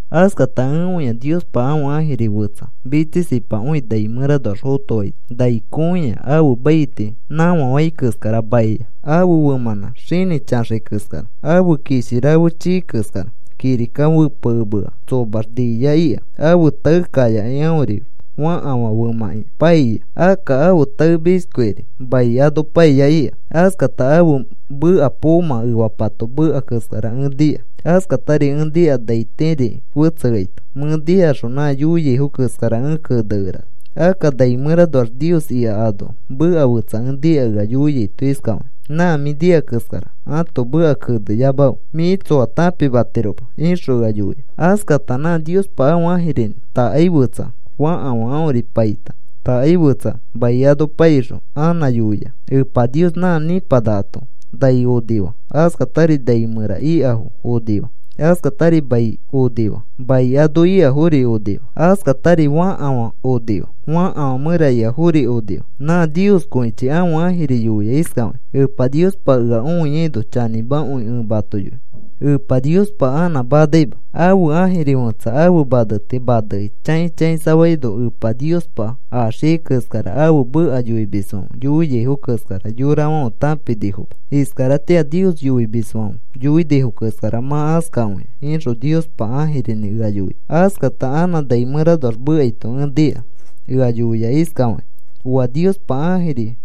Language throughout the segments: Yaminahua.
Askata ẽ õia Niospa ãfe ãjiri fetsa mitsisipakõi nai mẽranoax fotoaito, nai kõiya. Ãfe maiti nãfa fai keskara maia. Ãfe femãnã xinĩ chaxai keskara. Ãfe kishi rafe chii keskara. Kirika fepekemea tsomax nia ika. Ãfe tae kayakai aõri fakafã femãkĩa paia. Akka ãfe tae oshkiori mai ano paia ika. Askata ãfe meka poomã efapato meka keskara ẽ nika. Askatari ẽ nika naitiriki fetseaito. Mẽ nikaxõ nã yoiafo keskara ẽ kenekerana. Akka nai mẽranoax Nios ika anoa meka fetsa ẽ nika ea yoiaito iskafakĩ: “Nã mĩ nika keskara ãto meka keneyamafe. Mĩ tsoa tãpimatiroma,” ixõ ea yoia. Askata nã Niospa ãfe ãjirinĩ takai fetsa fakafã aõri paita takai fetsari mai ano paixõ anã yoia. Epa Nios nã nipanakato nai onifaa. Askatari nai mẽra ikafo onifaa. Askatari mai onifaa. Mai ano ikafori onifaa. Askatari fakafã onifaa. Fakafã mẽra ikafori onifaa. Nã Nioskõichi ãfe ãjiri yoia iskafakĩ: “Epa Niospa ea õiaino chanĩmakõi ẽ mato yoi. Epa Niospa anã manaima. Ãfe ãjiri fẽtsa ãfe maneti manekĩ chãi chãisafaino Epa Niospa axiai keskara ãfe meka yoimisfãfe yoiaifo keskara yorafãfe tãpinifoma. Iskaratĩa a Nios yoimisfãfe yoinifo keskara mã askakõia,” ixõ Niospa ãjirinĩ ea yoia. Askata anã nai mẽranoax mekaito ẽ nika ea yoia iskafakĩ: “Oa Niospa ãjiri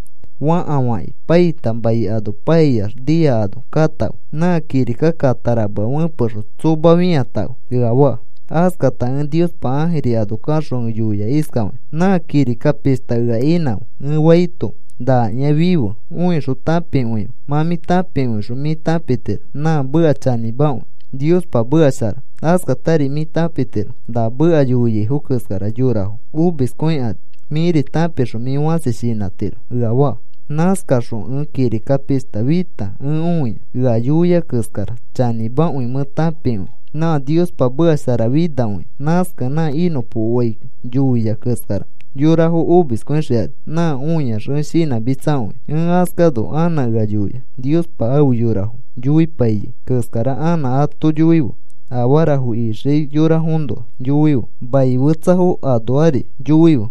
fakafãki paita mai ano paiax nia ano katãfe. Nã kirika kataramea fẽpexõ tsoma fĩatãfe,” ea faa. Askata ẽ Niospa ãjiri ano kaxõ ẽ yoia iskafakĩ: “Nã kirika pishta ea inãfe,” ẽ faito, “Nakĩa, fife. Õixõ tãpikõife. Mã tãpikõixõ mĩ tãpitiro nã meka chanĩmakõi. Niospa meka shara. Askatari mĩ tãpitiro na meka yoiaifo keskara yorafo omiskõikani. Mĩri tãpixõ mĩ fãsi shinãtiro,” ea faa. Nãskaxõ ẽ kirika pishta fita ẽ õia. Ea yoia keskara chanĩmakõi mẽ tãpikõia. Nã Niospa meka sharafinakõia. Nãskakẽ nã inõpokoai yoia keskara yorafo omiskõixikani. Nã õiax ẽ shinãmitsakõia. Ẽ askano, anã ea yoia: “Niospa afe yorafo yoipaiyai keskara anã ato yoife. Afarafo ixiai yorafoõnoa yoife, manifetsafoõnoari yoife,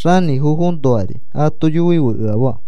xanĩfofoõnoari ato yoife,” ea faa.